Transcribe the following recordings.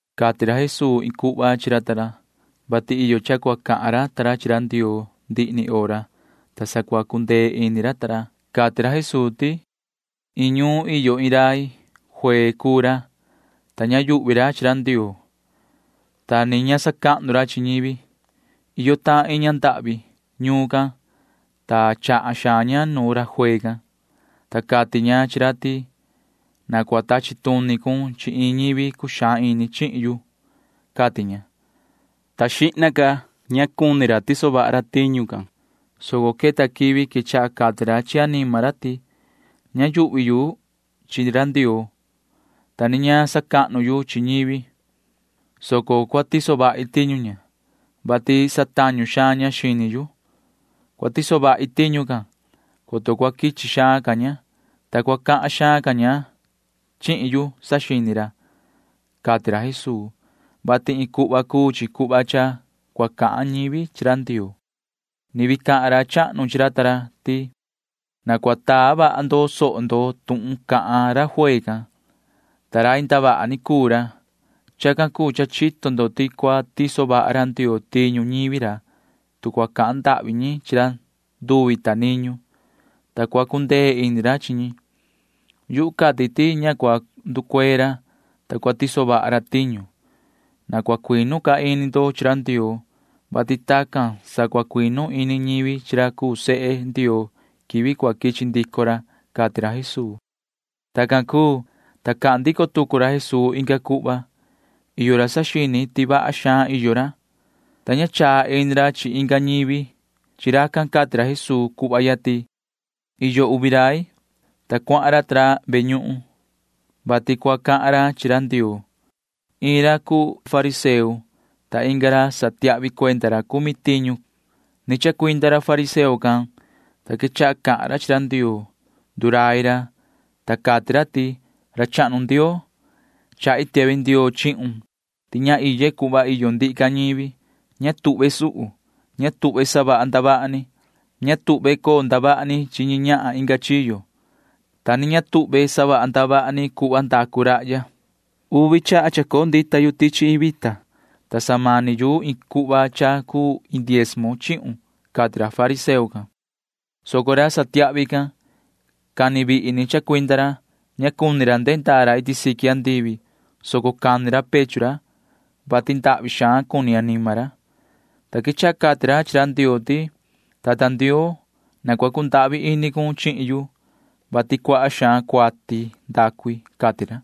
Cati ra Jesuu iin cuhva chi ra ta ra, vati iyo cha cua cahan ra ta ra chi ra Ndioo ndihi ni hora, ta sa cua cundee ini ra ta ra. ―Iin ñuun iyo iin rai. Juee cuu ra, ta ña yuhvi ra chi ra Ndioo, ta ni ña sacahnu ra chi ñivi. Iyo tahan iin ña ndahvi ñuun can, ta chahan xaan ña nu ra juee can, ta cati ña chi ra ti: “Na cua tachi tuni cun chi iin ñivi cuxaan ini chihin yu,” cati ña, ta xihna ca ña cuni ra tiso vaha ra tiñu can, soco queta quivi quechaha cati ra chi anima ra ti: “Ña yuhvi yu chi ra Ndioo, ta ni ña sacahnu yu chi ñivi, soco cua tiso vahi tiñu ña, vati satañu xaan ña xini yu. Cua tiso vahi tiñu can, coto cua quichi xaan ca ña, ta cua cahan xaan ña chihin yu,” saxini ra ―cati ra Jesuu, [vati iin cuhva cuu chi cuhva cha cua cahan ñivi chi ra Ndioo]. Ni vii cahan ra chahnu chi ra ta ra ti: ―Na cua taa vaha ndo soho ndo tuhun cahan ra juee can, ta rai ndavaha ni cuu ra. Chacan cuu cha chito ndo ti cua tiso vaha ra Ndioo tiñu ñivi ra, tu cua cahan ndahvi ñi chi ra nduvi ta niñu, ta cua cundee ini ra chi ñi. Yuhu cati ti ña cua nducuee ra, ta cua tiso vaha ra tiñu. Na cua cuinu ca ini ndo chi ra Ndioo, vati tacan sa cua cuinu ini ñivi chi ra cuu sehe Ndioo quivi cua quichi ndico ra ―cati ra Jesuu. Tacan cuu, ta cahan ndico tucu ra Jesuu inga cuhva. Iyo ra saxini ti vaha xaan iyo ra, ta ña chaa ini ra chi inga ñivi. Chi racan cati ra Jesuu cuhva ya ti: ―Iyo uvi rai, ta cuahan ra ta ra ve ñuhun, vati cua cahan ra chi ra Ndioo. Iin ra cuu iin ra fariseo, ta ra satiahvi cuenda ra cumi tiñu cuu inga ra. Ni chacuinda ra fariseo can, ta quechaha cahan ra chi ra Ndioo. [Ndurai ra,] ta cati ra ti: “Ra chahnu Ndioo, chahi tiahvi ndioo chihun ti ña iye cuhva iyo ndihi ca ñivi. Ña tuhve suhu. Ña tuhve savaha ndavaha ni. Ña tuhve coo ndavaha ni chi ñi ñahan inga chiyo, ta ni ña tuhve savaha ndavaha ni cuhva ndacu rahya. Uvi chaha chacoo ndita yu tichi iin vita, ta samani yu iin cuhva cha cuu iin diezmo chihun,” cati ra fariseo can, soco ra satiahvi can―cani vihi ni chacuinda ra. Ña cuni ra ndehe ndaa ra iti siqui andivi, soco cani ra pechu ra, [vati ndahvi xaan cuni anima ra,] ta quechaha cati ra chi ra Ndioo ti: “Tata Ndioo, na cua cundahvi ini cun chihin yu, vati cuaha xaan cuati ndacu i,” cati ra.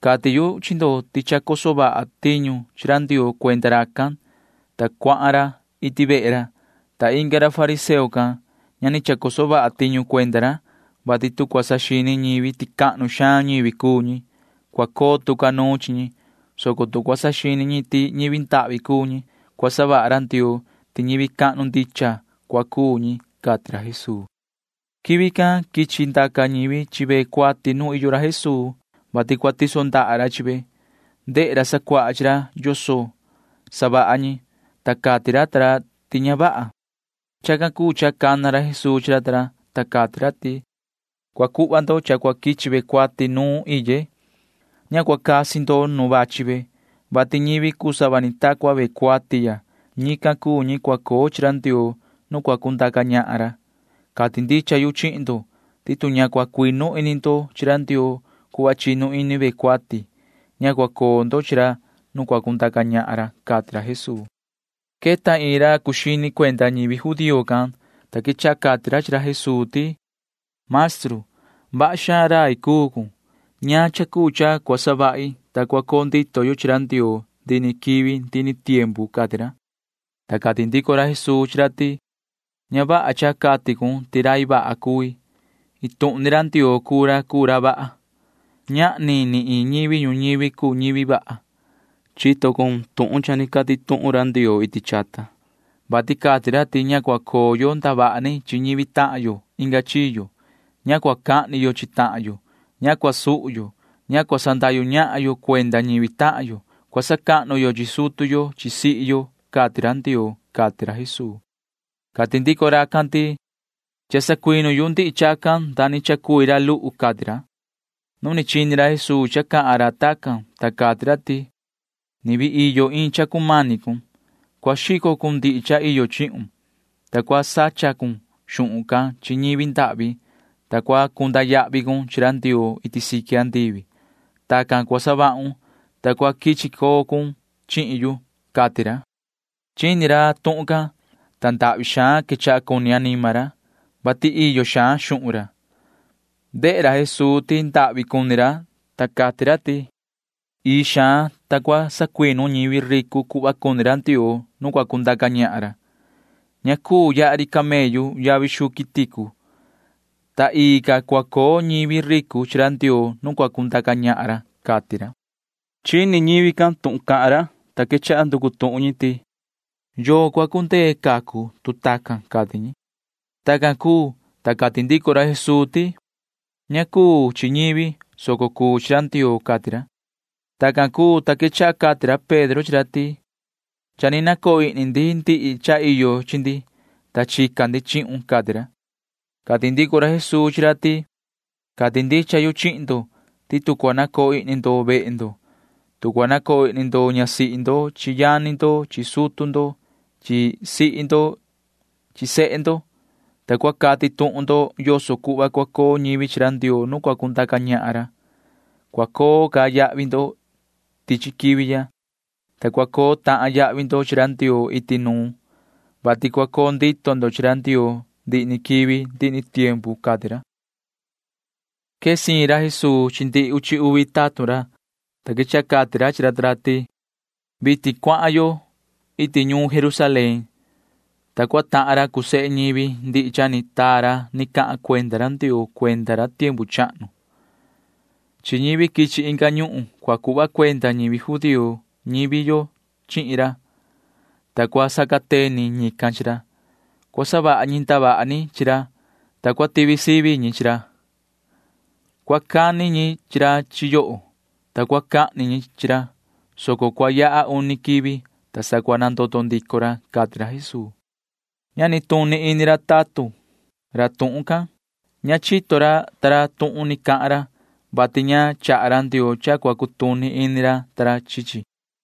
Cati yu chi ndo ti cha chacoso vaha tiñu chi ra Ndioo cuenda racan, ta cuahan ra iti vehe ra. Ta inga ra fariseo can―ña ni chacoso vaha tiñu cuenda ra, vati tu cua saxini ñivi ti cahnu xaan ñivi cuu ñi, cua coo tu ca nuun chi ñi, soco tu cua saxini ñi ti ñivi ndahvi cuu ñi, cua savaha ra Ndioo ti ñivi cahnu ndicha cua cuu ñi ―cati ra Jesuu. Quivi can quichi ndaca ñivi chi ve cuati nu iyo ra Jesuu, vati cua tiso ra ndaha ra chi ve. Ndehe ra sacuaha chi ra yoso savaha ñi, ta cati ra ta ra ti ña vaha. Chacan cuu cha cana ra Jesuu chi ra ta ra, ta cati ra ti: ―Cua cuhva ndo cha cua quichi ve cuati nu iye. Ña cua casi ndo nu vachi ve, vati ñivi cuu sava ni ta cua ve cuati ya―ñican cuu ñi cua coo chi ra Ndioo nu cua cundaca ñahan ra. Cati ndicha yu chihin ndo ti tu ña cua cuinu ini ndo chi ra Ndioo cuhva chinu ini ve cuati, ña cua coo ndo chi ra nu cua cundaca ñahan ra ―cati ra Jesuu. Queta iin ra cuu xini cuenda ñivi judío can, ta quechaha cati ra chi ra Jesuu ti: ―Maestru, vaha xaan rai cuu cun. ¿Ñaan cha cuu cha cua savahi, ta cua coo ndito yu chi ra Ndioo ndihi ni quivi ndihi ni tiempu? ―cati ra. Ta cati ndico ra Jesuu chi ra ti: ―Ña vaha cha cati cun ti rai vaha cui. Iin tuhun ni ra Ndioo cuu ra cuu ra vaha. Ñahni ni iin ñivi ñuñivi cuu ñivi vaha. Chito cun tuhun cha ni cati tuhun ra Ndioo iti chata, vati cati ra ti ña cua coo yo ndavaha ni chi ñivi tahan yo inga chiyo. Ña cua cahni yo chi tahan yo. Ña cua suhu yo. Ña cua sandahyu ñahan yo cuenda ñivi tahan yo. Cua sacahnu yo chi sutu yo chi sihi yo, cati ra Ndioo ―cati ra Jesuu. Cati ndico racan ti: ―Cha sacuinu yu ndihi chacan nda ni chacui ra luhu ―cati ra. Nu ni chini ra Jesuu cha cahan ra tacan, ta cati ra ti: ―Ni vii iyo iin cha cumani cun. Cua xico cun ndihi cha iyo chihun, ta cua sacha cun xuhun can chi ñivi ndahvi, ta cua cunda yahvi cun chi ra Ndioo iti siqui andivi. Tacan cua savahun, ta cua quichi coo cun chihin yu ―cati ra. Chini ra tuhun can, ta ndahvi xaan quechaha cuni anima ra, vati iyo xaan xuhun ra. Ndehe ra Jesuu ti ndahvi cuni ra, ta cati ra ti: ―Ii xaan, ta cua sacuinu ñivi ricu cuhva cuni ra Ndioo nu cua cundaca ñahan ra. Ña cuu yaha ri camellu yavi xuu quiticu, ta ii ca cua coo ñivi ricu chi ra Ndioo nu cua cundaca ñahan ra ―cati ra. Chini ñivi can tuhun cahan ra, ta quechaha nducu tuhun ñi ti: ―¿Yoo cua cundee cacu, tu tacan? ―cati ñi. Tacan cuu, ta cati ndico ra Jesuu ti: ―Ña cuu chi ñivi, soco cuu chi ra Ndioo ―cati ra. Tacan cuu, ta quechaha cati ra Pedro chi ra ti: ―Cha ni nacoo ihni ndi ndihi cha iyo chi ndi, ta chica ndi chihun ―cati ra. Cati ndico ra Jesuu chi ra ta ra ti: ―Cati ndicha yu chihin ndo ti tu cua nacoo ihni ndo vehe ndo, tu cua nacoo ihni ndo ñasihi ndo chi yani ndo chi sutu ndo chi sihi ndo chi sehe ndo, ta cua cati tuhun ndo yoso cuhva cua coo ñivi chi ra Ndioo nu cua cundaca ñahan ra, cua coo ca yahvi ndo tichi quivi ya, ta cua coo tahan yahvi ndo chi ra Ndioo iti nuun, vati cua coo ndito ndo chi ra Ndioo ndihi ni quivi ndihi ni tiempu ―cati ra. Quee siin ra Jesuu chi ndihi uchi uvi tatun ra, ta quechaha cati ra chi ra ta ra ti: ―Vitin cuahan yo iti ñuun Jerusalén, ta cua tahan ra cuu sehe ñivi ndihi cha ni taa ra ni cahan cuenda ra Ndioo cuenda ra tiempu chahnu. Chi ñivi quichi inga ñuhun cua cuhva cuenda ñivi judío ñivi yo chihin ra, ta cua sacateni ñican chi ra. Cua savaha ñi ndavaha ni chi ra, ta cua tivi sivi ñi chi ra. Cua cani ñi chi ra chi yoho, ta cua cahni ñi chi ra, soco cua yaha uni quivi, ta sa cua nandoto ndico ra ―cati ra Jesuu. Ña nituni ini ra tatun ra tuhun can. Ña chito ra ta ra tuhun ni cahan ra, vati ña chaha ra Ndioo cha cua cutuni ini ra ta ra chi chi.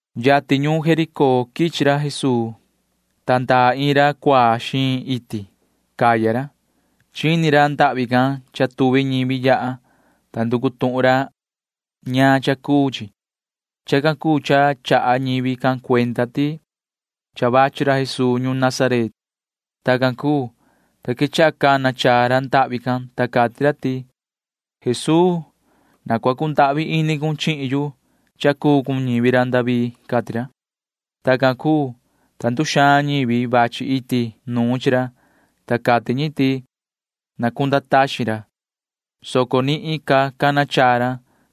Yatin ñuun Jericó quichi ra Jesuu, ta ndaa iin ra cuaa xiin iti. Caya ra. Chini ra ndahvi can cha tuvi ñivi yaha, ta nducu tuhun ra ñaan cha cuu chi. Chacan cuu cha chaha ñivi can cuenda ti cha vachi ra Jesuu ñuun Nazaret. Tacan cuu, ta quechaha cana chaa ra ndahvi can, ta cati ra ti: ―Yoho Jesuu, na cua cundahvi ini cun chihin yu, yoho cuu ñivi ra David ―cati ra. Tacan cuu, ta nduxaan ñivi vachi iti nuun chi ra, ta cati ñi ti na cunda taxin ra, soco nihin ca cana chaa ra,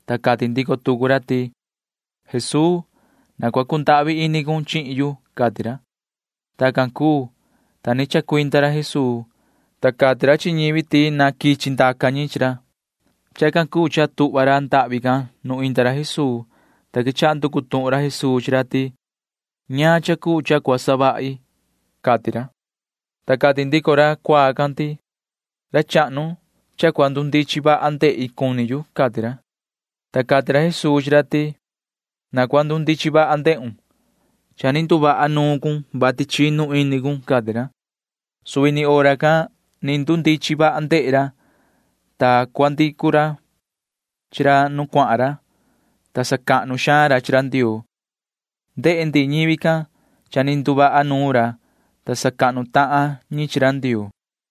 ta cati ndico tucu ra ti: ―Yoho Jesuu, na cua cundahvi ini cun chihin yu ―cati ra. Tacan cuu, ta ni chacuinda ra Jesuu, ta cati ra chi ñivi ti na quichi ndaca ñi chi ra. Chacan cuu cha tuhva ra ndahvi can nu inda ra Jesuu, ta quechaha nducu tuhun ra Jesuu chi ra ti: ―¿Ñaan cha cuu cha cua savahi cuni cun? ―cati ra. Ta cati ndico ra cuaa can ti: ―Ra chahnu, cha cua ndundichin vaha ndehi cuni yu ―cati ra. Ta cati ra Jesuu chi ra ti: ―Na cua ndundichin vaha ndehun. Cha ni nduvaha nuun cun, vati chinu ini cun ―cati ra. Suvi ni hora can ni ndundichin vaha ndehe ra, ta cuandicu ra chi ra nu cuahan ra, ta sacahnu xaan ra chi ra Ndioo. Ndehe ndihi ñivi can cha ni nduvaha nuun ra, ta sacahnu tahan ñi chi ra Ndioo.